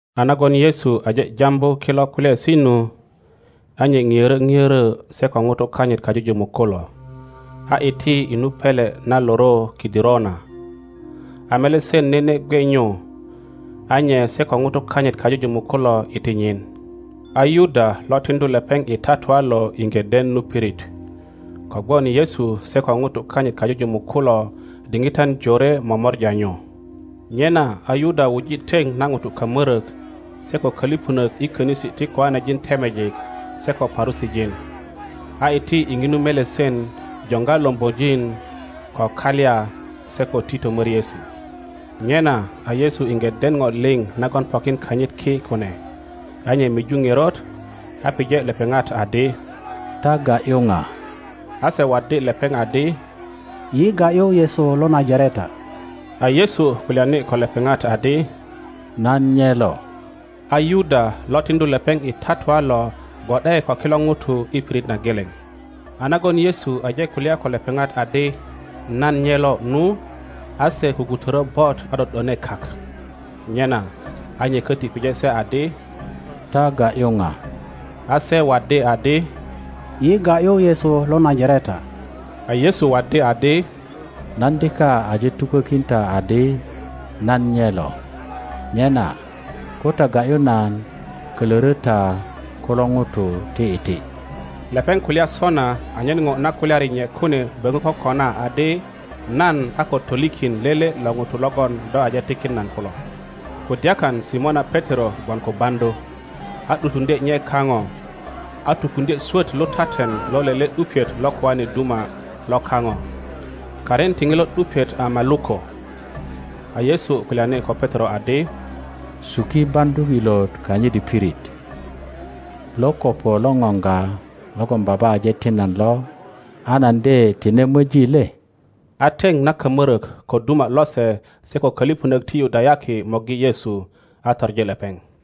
A nagon Yesu aje jambu kilo kulyaesi nu, a nye ŋiörö ŋiörö se ko ŋutu kanyit kajujumuk kulo, a iti i nu pele na loro Kidirona. A melesen nene gwe nyu, a nye se ko ŋutu kanyit kajujumuk kulo iti nyin. A Yuda lo tiŋdu lepeŋ i tatua lo iŋge den nu pirit, kogwon Yesu se ko ŋutu kanyit kajujumuk kulo diŋitan jore momorja nyu. Nyena a Yuda wuji teŋ na ŋutu kamörok se ko köliponok i konisi ti kiŋanejin temejik se ko Parusijin, a iti i ŋinu melesen joŋga lombojin ko kalya se ko tito moriesi. Nyena a Yesu iŋge den ŋo liŋ nagon pokin kanyit ki kune, a nye miju ŋerot, a pije lepeŋat adi, Ta ga ’yu ŋa? A se waddi lepeŋ adi, Yi ga ’yu Yesu lo Najareta. A Yesu kulyani ko lepeŋat adi, Nan nye lo. A Yuda lo tiŋdu lepeŋ i tatua lo gwo ’de ko kilo ŋutu i pirit na geleŋ. A nagon Yesu aje kulya ko lepeŋat adi, Nan nye lo nu, a se kukutörö bot a ’do ’done kak. Nyena a nye köti pije se adi, Ta ga ’yu ŋa? A se waddi adi, Yi ga ’yu Yesu lo Najareta. A Yesu waddi adi, Nan dika aje tukökin ta adi nan nye lo. Nyena ko ta ga ’yu nan kölörö ta kulo ŋutu ti iti. Lepeŋ kulya sona anyen ŋo na kulyari nye kune böŋö kokona adi, Nan a ko tolikin lele lo ŋutu logon do aje tikin nan kulo. Kudyakan Simona Petero gwon ko baŋdu, a ’dutuŋdye nye kaŋo, a tukuŋdye swöt lutaten lo lele ’dupiet lo kijane duma lo kaŋo. Karin ti ŋilo ’dupiet a Maluko. A Yesu kulyani ko Petero adi, Suki baŋdu ilot kanyit i pirit. Lo kopo lo ŋoŋga logon Baba aje tin nan lo a nan de tine möji le? A teŋ na kamörök ko duma lose se ko kölipönök ti Yudayaki morgi Yesu, a toŋi lepeŋ.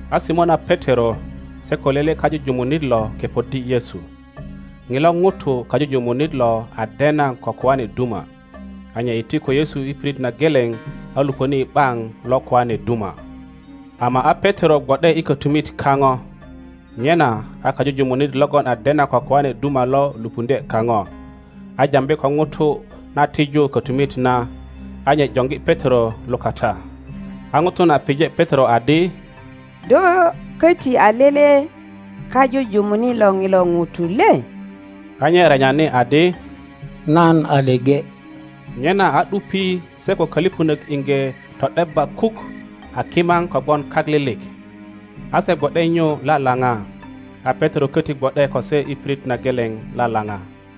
A Simona Petero se ko lele kajujumunit lo kepoddi Yesu. Ŋilo ŋuto kajujumunit lo a dena ko koane duma. a nye iti ko Yesu i pirit na geleŋ a luponi i ’baŋ lo koane duma, ama a Petero gwo ’de i kötumit kaŋo. Nyena a kajujumunit logon a dena ko koane duma lo lupuŋdye kaŋo, a jambi ko ŋuto na tiju kötumit na, a nye joŋgi Petero lukata. A ŋuto na pije Petero adi, Do köti a lele kajujumunit lo ŋilo ŋuto le? A nye renyani adi, Nan a leŋe. Nyena a ’dupi se ko kölipönök iŋge to ’debba kuk a kimaŋ kogwon kak lilik, a se gwo ’de nyu lalaŋa, a Petero köti gwo ’de ko se i pirit na geleŋ lalaŋa.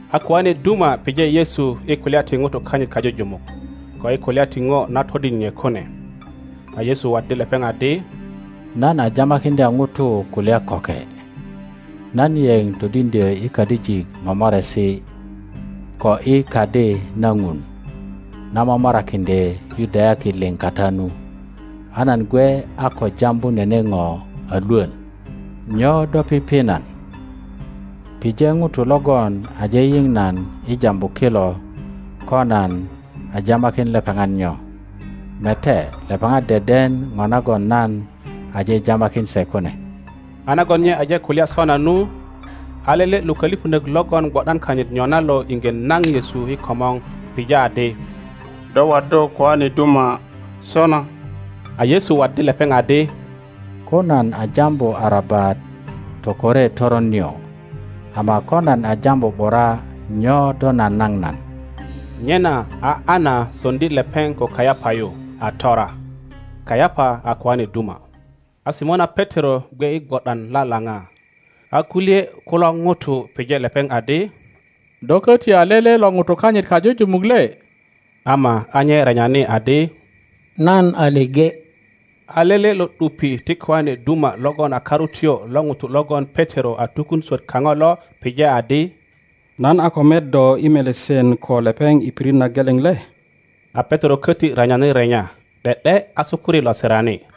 A koane duma pije Yesu i kulya ti ŋutu kanyit kajujumuk, ko i kulya ti ŋo na todin nye kune. A Yesu waddi lepeŋ adi, Nan a jamakiŋdya ŋutu kulya köke; nan yeŋ todiŋdyö i kadijik momoresi ko i Kadi na Ŋun na momorakiŋdye Yudayaki liŋ kata nu, a nan gwe a ko jambu nene ŋo a lwön. Nyo do pipi nan? Pije ŋutu logon aje yiŋ nan i jambu kilo ko nan a jamakin lepeŋat nyo. Mete, lepeŋat deden ŋo nagon nan aje jamakin se kune. a nagon nye aje kulya sona nu, a lele lo kölipönök logon gwo ’dan kanyit nyona lo iŋge naŋ Yesu i komor pija adi, Do waddu koane duma sona? a Yesu waddi lepeŋ adi, Ko nan a jambu arabat tokore toron nio; ama ko nan a jambu ’bura, nyo do nanaŋ nan? Nyena a Ana so ŋdi lepeŋ ko Kayapa yu a tora. Kayapa a koane duma. A Simona Petero gwe i gwo ’dan lalaŋa. A kulye kulo ŋutu pije lepeŋ adi, Do köti a lele lo ŋutu kanyit kajujumuk le? Ama a nye renyani adi, Nan a leŋe. A lele lo ’dupi ti koane duma logon a karutyo lo ŋuto logon Petero a tukun swöt kaŋo lo pije adi, Nan a ko met do i melesen ko lepeŋ i pirit na geleŋ le? A Petero köti renyani renya, ’de ’de a sukuri lo sirani.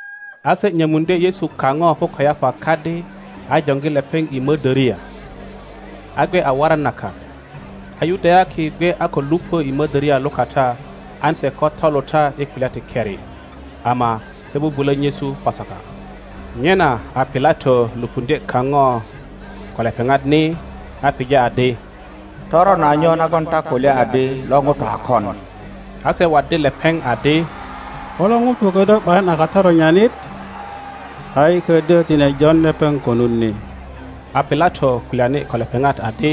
A se nyömuŋdye Yesu kaŋo ko Kayapa kadi, a joŋgi lepeŋ i modoria. A gwe a waran na kak. A Yudayaki gwe a ko lupö i mödöria lukata an se ko toluta i kulya ti keri, ama se bubulö nyesu Pasaka. Nyena a Pilato lupuŋdye kaŋo ko lepeŋat ni, a pije adi, Toron a nyo nagon ta kulya adi lo ŋuto a kon? A se waddi lepeŋ adi, Ko lo ŋuto ködyö ’bayin a katoronyanit, a yi ködyö tine jon lepeŋ konut ni. A Pilato kulyani ko lepeŋat adi,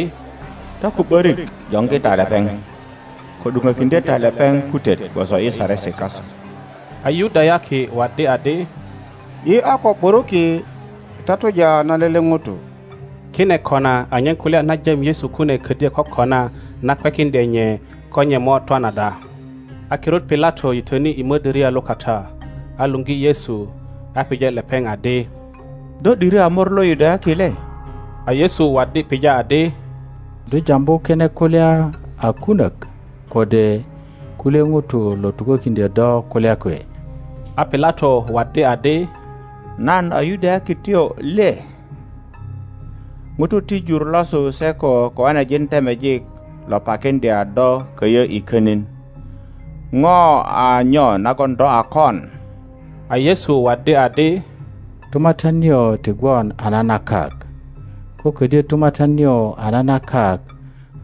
Ta ko ’börik joŋgi ta lepeŋ, ko ’duŋökiŋdye ta lepeŋ putet gwoso i saresi kasu. A Yudayaki waddi adi, Yi a ko ’buruki i tatuja na lele ŋuto. Kine kona anyen kulya na jam Yesu kune ködyö kokona na kwekiŋdye nye ko nye mo twan ada. a kirut Pilato yitöni i mödöria lukata, a luŋgi Yesu, a pije lepeŋ adi, Do ’diri a mor lo Yudayaki le? A Yesu waddi pija adi, Do jambu kine kulya a kunök, kode kulye ŋutu lo tukökiŋdyö do kulya kwe? A Pilato waddi adi, Nan a Yudayakityo le? ŋutu ti jur losu se ko koanejin temejik lo pakiŋdya do köyö i könin. Ŋo a nyo nagon do a kon? A Yesu waddi adi, Tumatyan nio ti gwon a na na kak. Ko ködyö tumatyan nio a na na kak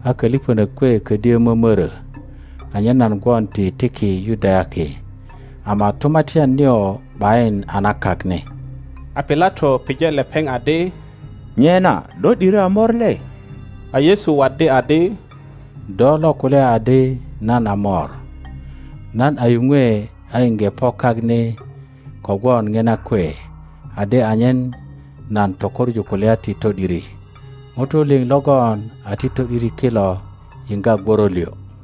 a kölipönök kwe ködyö mömörö, anyen nan gwon ti tiki Yudayaki, ama tumatyan nio ’bayin a na kak ni. A Pilato pije lepeŋ adi, Nyena do ’diri a mor le? A Yesu waddi adi, Do lo kulya adi nan a mor. Nan a yuŋwe a iŋge po kak ni kogwon ŋina kwe adi anyen nan tokoŋu kulya ti to ’diri. ŋutu liŋ logon a ti to ’diri kilo yiŋga gworo liŋ.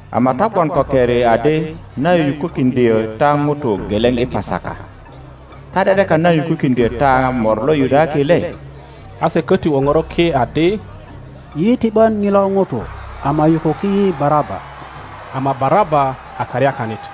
ama ta gwon ko keri adi nan yukukiŋdyö ta ŋuto geleŋ i Pasaka. Ta ’de ’dekan nan yukukiŋdyö ta mor lo Yudayaki le? A se köti woŋoro ki adi, Yi ti ’bön ŋilo ŋuto, ama yukuki yi Baraba! Ama Baraba a karyakanit.